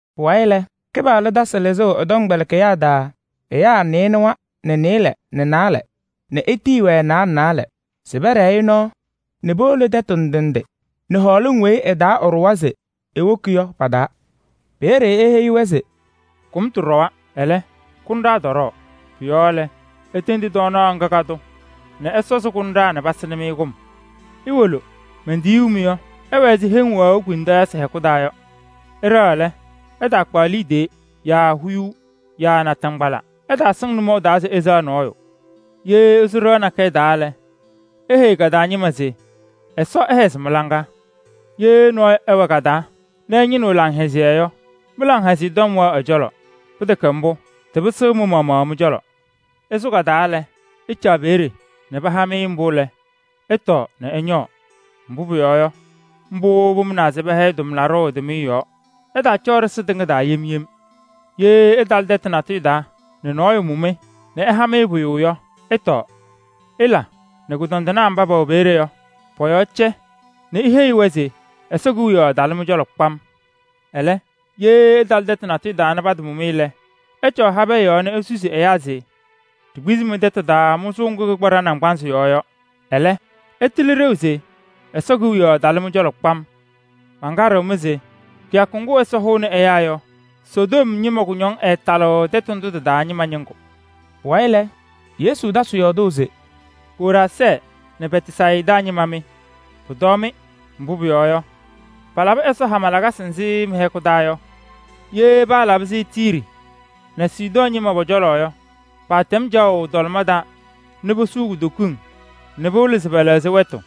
Pʋwayɩ lɛ, Kɩpaɣlʋ tasɩ lɩzʋʋ ɛ-tɔmkpɛlɩkɩyaa taa ɛyaa nɩɩnʋwa nɛ nɩɩlɛ nɛ naalɛ nɛ etiyi-wɛ naalɛ naalɛ se pɛɖɛɛ-ɩ nɔɔ nɛ powolo tɛtʋ ndɩ ndɩ nɛ hɔɔlɩŋ weyi ɩ-taa ɛɖʋwa se ewoki yɔ pa-taa. Peeye eheyi-wɛ se: “Kʋmtʋ ɖɔwa, ɛlɛ, kʋnɖaa tɔɖɔɔ. Pʋ-yɔɔ lɛ, itendi tɔɔnaɣ ŋga ka-tʋ nɛ ɛsɔzɩ kʋnɖaa nɛ pasɩnɩ-mɩ kʋm. Iwolo. Mentiyuu-mɩ yɔ, ɩwɛ ɛzɩ heŋ wɛɣʋ kpemtɔɔyɩsɩ hɛkʋ taa yɔ. Ɩɖɛɣ lɛ, ɩtaakpaɣ liidiye yaa huyuu yaa naataŋgbala. Ɩtaasɩŋ nʋmɔʋ taa se ɩsɛɣ nɔɔyʋ. Ye ɩsʋ ɖɩɣa nakɛyɛ taa lɛ, iheyi ka-taa ñɩma se: ‘Ɛsɔ ɛhɛzɩ mɩ-laŋa.’ Ye nɔɔyʋ ɛwɛ ka-taa nɛ ɛñɩnɩɣ laŋhɛzɩyɛ yɔ, mɩ-laŋhɛzɩyɛ tɔm wɛɣ ɛ-cɔlɔ. Pɩtɛkɛ mbʋ, tɩpɩsɩɣ mɩ-maɣmaɣ mɩ-cɔlɔ. Ɩsʋ ka-taa lɛ, ɩcaɣ peeye nɛ paha-mɩ mbʋ lɛ, ɩtɔɔ nɛ ɩñɔɔ. Mbʋ pʋyɔɔ yɔ, mbʋ pʋmʋnaa se pɛhɛyɩ tʋmlaɖʋ ɛ-tʋmɩyɛ yɔɔ. Ɩtaacɔɔ ɖɩsɩ tɩŋa taa yem yem. Ye ɩtalɩ tɛtʋ natʋyʋ taa nɛ nɔɔyʋ mʋ-mɩ nɛ ɛha-mɩ pʋyʋ yɔ, ɩtɔɔ. Ɩla nɛ kʋdɔndɩnaa mba pɛwɛ peeye yɔ pɔ-yɔɔ cɛ nɛ iheyi-wɛ se Ɛsɔ Kewiyaɣ talɩ mɩ-cɔlɔ kpam. Ɛlɛ, ye ɩtalɩ tɛtʋ natʋyʋ taa nɛ patamʋ-mɩ lɛ, ɩcɔɔ habɛɛ yɔɔ nɛ isusi ɛyaa se: ‘Ɖikpizi-mɩ mɩ-tɛtʋ taa mʋzʋʋ ŋgʋ kɩkpa ɖa-naŋgbanzɩ yɔɔ yɔ. Ɛlɛ, ɩtɩlɩ ɖeu se Ɛsɔ Kewiyaɣ talɩ-mɩ cɔlɔ kpam.’ Mankaɖɩɣ-mɩ se kɩyakʋ ŋgʋ Ɛsɔ hʋʋnɩ ɛyaa yɔ, Sodom ñɩma kʋñɔŋ ɛɛtalɩɣ tɛtʋ ndʋ tɩ-taa ñɩma ñɩŋgʋ.” Pʋwayɩ lɛ, Yesu tasɩ yɔɔdʋʋ se: “Koraazɛɛ nɛ Bɛtsayɩda ñɩma mɩ! Pʋtɔɔ-mɩ! Mbʋ pʋyɔɔ yɔ, palabɩ Ɛsɔ hama lakasɩ nzɩ mɩ-hɛkʋ taa yɔ, ye paalabɩ-sɩ Tiiri nɛ Sidɔɔ ñɩma pɔ-cɔlɔ yɔ, paatɛm caɣʋ tɔlɩma taa nɛ posuu kutokiŋ nɛ pɩwɩlɩ se pɛlɛɣzɩ wɛtʋ.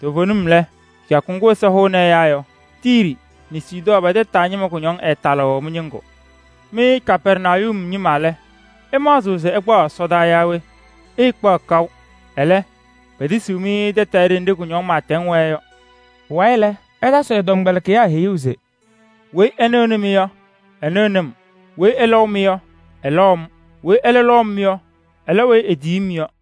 Toovenim lɛ, kɩyakʋ ŋgʋ Ɛsɔ hʋʋnɩ ɛyaa yɔ, Tiiri nɛ Sidɔɔ pɛ-tɛtʋ taa ñɩma kʋñɔŋ ɛɛtalɩɣ mɩ-ñɩŋgʋ. Mɩ Kapɛrnayum ñɩma lɛ, ɩmaɣzɩɣ se ɩkpaɣ ɛsɔdaa yaa we? Ɩɩkpaɣ kaʋ. Ɛlɛ, petisiɣ-mɩ tɛtɛɛ ɖenɖe kʋñɔŋ pɩɩtɛŋ wɛɛ yɔ.” Pʋwayɩ lɛ, ɛtasɩ ɛ-tɔmkpɛlɩkɩyaa heyuu se: “Weyi ɛnɩɣnɩ-mɩ yɔ, ɛnɩɣnɩ-m. Weyi ɛlɔʋ-mɩ yɔ, ɛlɔʋ-m. Weyi ɛlɛ lɔʋ-m yɔ, ɛlɔʋ weyi etiyi-m yɔ.”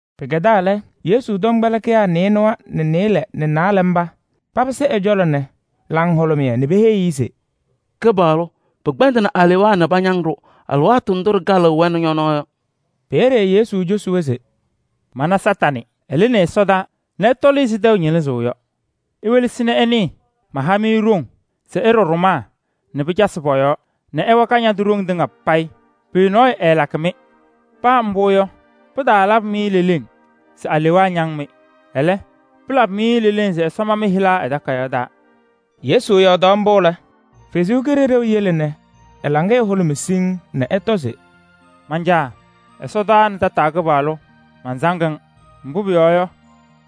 Pɩkɛdaa lɛ, Yesu tɔmkpɛlɩkɩyaa nɩɩnʋwa nɛ nɩɩlɛ nɛ naalɛ mba papɩsɩ ɛ-cɔlɔ nɛ laŋhʋlʋmɩyɛ nɛ peheyi-i se: “Kɩpaɣlʋ! Pɩkpɛndɩnɩ alewaa nɛ pañaŋ-ɖʋ alɩwaatʋ ndʋ ɖɩkalɩɣ-wɛ nɛ ñɔ-nɔɔ yɔ.” Peeye Yesu cosi-wɛ se: “Mana Kañadʋ Satanɩ, ɛlɩnɩ ɛsɔdaa nɛ ɛtɔlɩ ɛzɩ tɛʋ ñɩlɩzʋʋ yɔ. Iwelesi nɛ ɩnɩɩ, maha-mɩ ɖoŋ se ɩɖɔ ɖʋmaa nɛ pɩcasɩ pɔ-yɔɔ nɛ ɩwa Kañadʋ ɖoŋ tɩŋa payɩ. Pʋyʋ nɔɔyʋ ɛɛlakɩ-mɩ. Paa mbʋ yɔ, pɩtaalabɩ-mɩ leleŋ se alewaa ñaŋ-mɩ. Ɛlɛ, pɩlabɩ-mɩ leleŋ se Ɛsɔ ma mɩ-hɩla ɛ-takayaɣ taa.” Yesu yɔɔdaɣ mbʋ lɛ, Ɛsɔ Kalɩzaɣ yele nɛ ɛ-laŋɩyɛ hʋlʋmɩ siŋŋ nɛ ɛtɔ se: “Man-Caa! Ɛsɔdaa nɛ tataa Kɩpaɣlʋ! Mansaŋ-ŋ. Mbʋ pʋyɔɔ yɔ,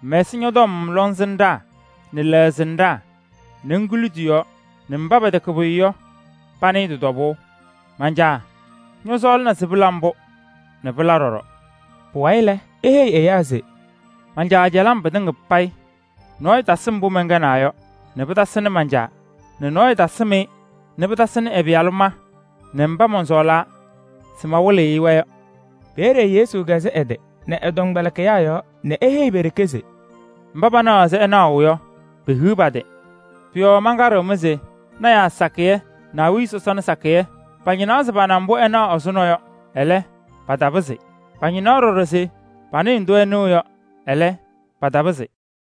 ŋmɛsɩ ñɔ-tɔm lɔŋsɩnɖaa nɛ lɛɣsɩnɖaa nɛ ŋkuli tɩ-yɔɔ nɛ mba pɛtɛkɛ pʋyʋ yɔ panɩɩ tɩ-tɔbʋʋ. Man-Caa! Ñɔsɔɔlɩna se pɩla mbʋ nɛ pɩla ɖɔɖɔ.” Pʋwayɩ lɛ, eheyi ɛyaa se: “Man-Caa cɛlɩ-m pɩtɩŋa payɩ. Nɔɔyʋ tasɩ mbʋ mɛnkɛnaa yɔ nɛ pɩtasɩnɩ man-Caa nɛ nɔɔyʋ tasɩm-ɩ nɛ pɩtasɩnɩ ɛ-Pɩyalʋ ma nɛ mba mɔnsɔɔlaa se mawɩlɩ-ɩ-wɛ yɔ.” Peeye Yesu kɛzɩ ɛ-tɩ nɛ ɛ-tɔmkpɛlɩkɩyaa yɔɔ nɛ eheyi pe-ɖeke se: “Mba panaɣ ɛzɩ ɩnaɣʋ yɔ, pehiɣ pa-tɩ! Pʋ-yɔɔ mankaɖɩɣ-mɩ se: lɔɔyɩsɩ tɩnaa sakɩyɛ nɛ awiya sɔsɔna sakɩyɛ pañɩnaɣ se pana mbʋ ɩnaɣ ɛzʋnɔ yɔ. Ɛlɛ, patapɩzɩ. Pañɩnaɣ ɖɔɖɔ se panɩɩ ndʋ ɩnɩɣ yɔ. Ɛlɛ, patapɩzɩ.”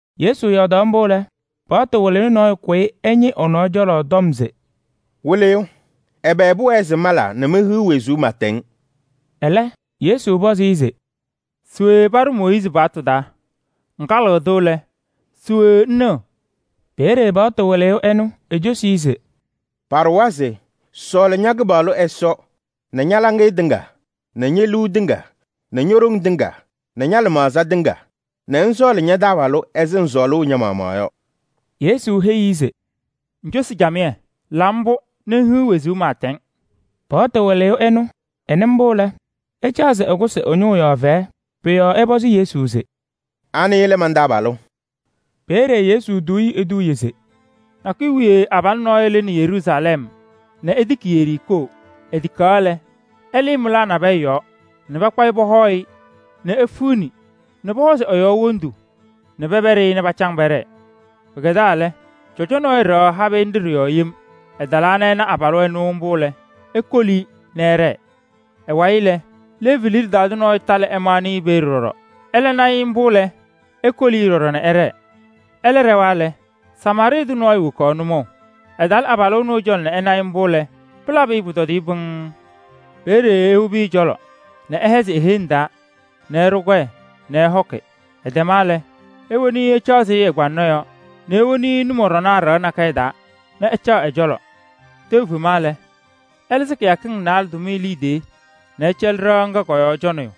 Yesu yɔɔdaɣ mbʋ lɛ, paɣtʋ wɩlɩyʋ nɔɔyʋ kʋyɩ ɛñɩ ɛ-nɔɔ cɔlɔ tɔm se: “Wɩlɩyʋ! Ɛbɛ pʋwɛɛ se mala nɛ mehiɣ wezuu pɩɩtɛŋ?” Ɛlɛ Yesu pɔzɩ-ɩ se: “Se we paɖʋ Mooyiizi paɣtʋ taa? Ŋkalɩɣ-tʋ lɛ, se we ŋnɩɣ?” Peeye paɣtʋ wɩlɩyʋ ɛnʋ ecosi-i se: “Paɖʋwa se: sɔɔlɩ ña-Kɩpaɣlʋ Ɛsɔ nɛ ña-laŋɩyɛ tɩŋa nɛ ñe-liu tɩŋa nɛ ño-ɖoŋ tɩŋa nɛ ña-lɩmaɣza tɩŋa nɛ ŋsɔɔlɩ ña-taabalʋ ɛzɩ ŋsɔɔlʋʋ ña-maɣmaɣ yɔ.” Yesu heyi-i se: “Ŋcosi camɩyɛ, la mbʋ nɛ ŋhiɣ wezuu pɩɩtɛŋ.” Paɣtʋ wɩlɩyʋ ɛnʋ ɛnɩ mbʋ lɛ, ɛcaɣ se ɛkʋsɩ ɛ-ñʋʋ yɔɔ fɛyɛ. Pʋ-yɔɔ ɛpɔzɩ Yesu se: “Anɩ lɛ man-taabalʋ?” Peeye Yesu tuu-i eduuye se: “Nakʋyʋ wiye abalʋ nɔɔyʋ lɩnɩ Yeruusalɛm nɛ etiki Yeriikoo. Etikaɣ lɛ, ɛlɩɩ mɩlaa nabɛyɛ yɔɔ nɛ pakpa-ɩ pɔhɔɔ-ɩ nɛ efiɣni nɛ pɔhɔzɩ ɛ-yɔɔ wondu nɛ pɛpɛɖɩ-ɩ nɛ pacaŋ pɛɖɛɛ. Pɩkɛdaa lɛ, cɔjɔ nɔɔyʋ ɖɛɣ habɩyɛ nɖɩ ɖɩ-yɔɔ yem. Ɛtalaa nɛ ɛna abalʋ ɛnʋ mbʋ lɛ, ekoli-i nɛ ɛɖɛɛ. Ɛ-wayɩ lɛ, Leevi liɖe taa tʋ nɔɔyʋ talɩ ɛmaɣnɩ-ɩ peeye ɖɔɖɔ. Ɛlɛ na-ɩ mbʋ lɛ, ekoli-i ɖɔɖɔ nɛ ɛɖɛɛ. Ɛlɛ ɖɛwa lɛ, Samaarɩɩ tʋ nɔɔyʋ wokaɣ nʋmɔʋ. Ɛtalɩ abalʋ ɛnʋ ɛ-cɔlɔ nɛ ɛna-ɩ mbʋ lɛ, pɩlabɩ-ɩ pʋtɔdɩyɛ pɩŋŋ. Peeye ewobi ɛ-cɔlɔ nɛ ɛhɛzɩ e-heŋ taa nɛ ɛɖʋ kɔyɛ nɛ ɛhɔkɩ. Ɛtɛma lɛ, ewoni-i ɛcaɣzɩ ɛ-kpaŋaɣ yɔɔ nɛ ewoni-i nʋmɔɖɔnaa ɖɩɣa nakɛyɛ taa nɛ ɛcaɣ ɛ-cɔlɔ. Tɛʋ fema lɛ, ɛlɩzɩ kɩyakɩŋ naalɛ tʋmɩyɛ liidiye nɛ ɛcɛlɩ ɖɩɣa ŋga kɔ-yɔɔ cɔnɩyʋ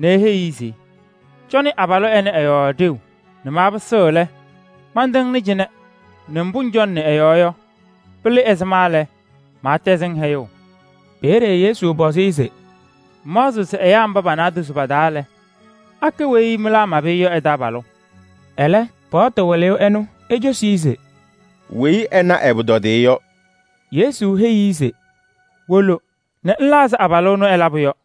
nɛ eheyi-i se: ‘Cɔnɩ abalʋ ɛnɛ ɛ-yɔɔ ɖeu nɛ maapɩsɩɣ lɛ, mantɩŋnɩ cɩnɛ nɛ mbʋ ŋcɔnɩnɩ ɛ-yɔɔ yɔ, pɩlɩ ɛzɩma yaa ɛzɩma lɛ, maatɛzɩ-ŋ hɛyʋʋ.’” Peeye Yesu pɔzɩ-ɩ se: “Ŋmaɣzɩɣ se ɛyaa mba pa-naadozo pa-taa lɛ, akɛ weyi mɩlaa mabɩ-ɩ yɔ ɛ-taabalʋ?” Ɛlɛ Paɣtʋ wɩlɩyʋ ɛnʋ ecosi-i se: “Weyi ɛna ɛ-pʋtɔdɩyɛ yɔ.” Yesu heyi-i se: “Wolo nɛ ŋla ɛzɩ abalʋ ɛnʋ ɛlabʋ yɔ.”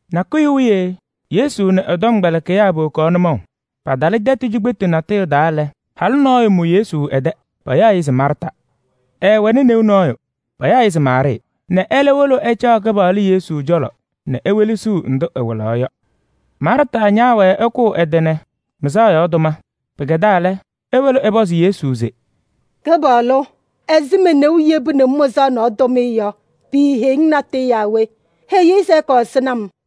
Nakʋyʋ wiye Yesu nɛ ɛ-tɔmkpɛlɩkɩyaa powokaɣ nʋmɔʋ. Patalɩ tɛtʋ cikpetu natʋyʋ taa lɛ, halʋ nɔɔyʋ mʋ Yesu ɛ-tɛ, payaɣ-ɩ se Maarta Ɛɛwɛnɩ neu nɔɔyʋ, payaɣ-ɩ se Maarɩɩ nɛ ɛlɛ wolo ɛcaɣ Kɩpaɣlʋ Yesu cɔlɔ nɛ ewelesiɣ ndʋ ɛwɩlaɣ yɔ. Maarta ñaawɛɛ ɛkʋʋ ɛ-tɩ nɛ mɩzaɣ nɔɔ tʋma. Pɩkɛdaa lɛ, ewolo ɛpɔzɩ Yesu se: “Kɩpaɣlʋ, ɛzɩ me-neu yebuni-m mɩzaɣ nɔɔ tʋmɩyɛ yɔ, piiheyiɣ-ŋ natʋyʋ yaa we? Heyi-i se ɛkɔɔ ɛsɩnɩ-m.”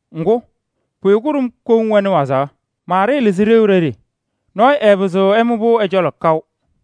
Ŋgʋ, pʋyʋ kʋɖʋm koŋ wɛnɩ wazaɣ. Maarɩɩ lɩzɩnɩ ɖeu ɖeɖe. Nɔɔyʋ ɛɛpɩzɩɣ ɛmʋ-pʋ ɛ-cɔlɔ kaʋ.”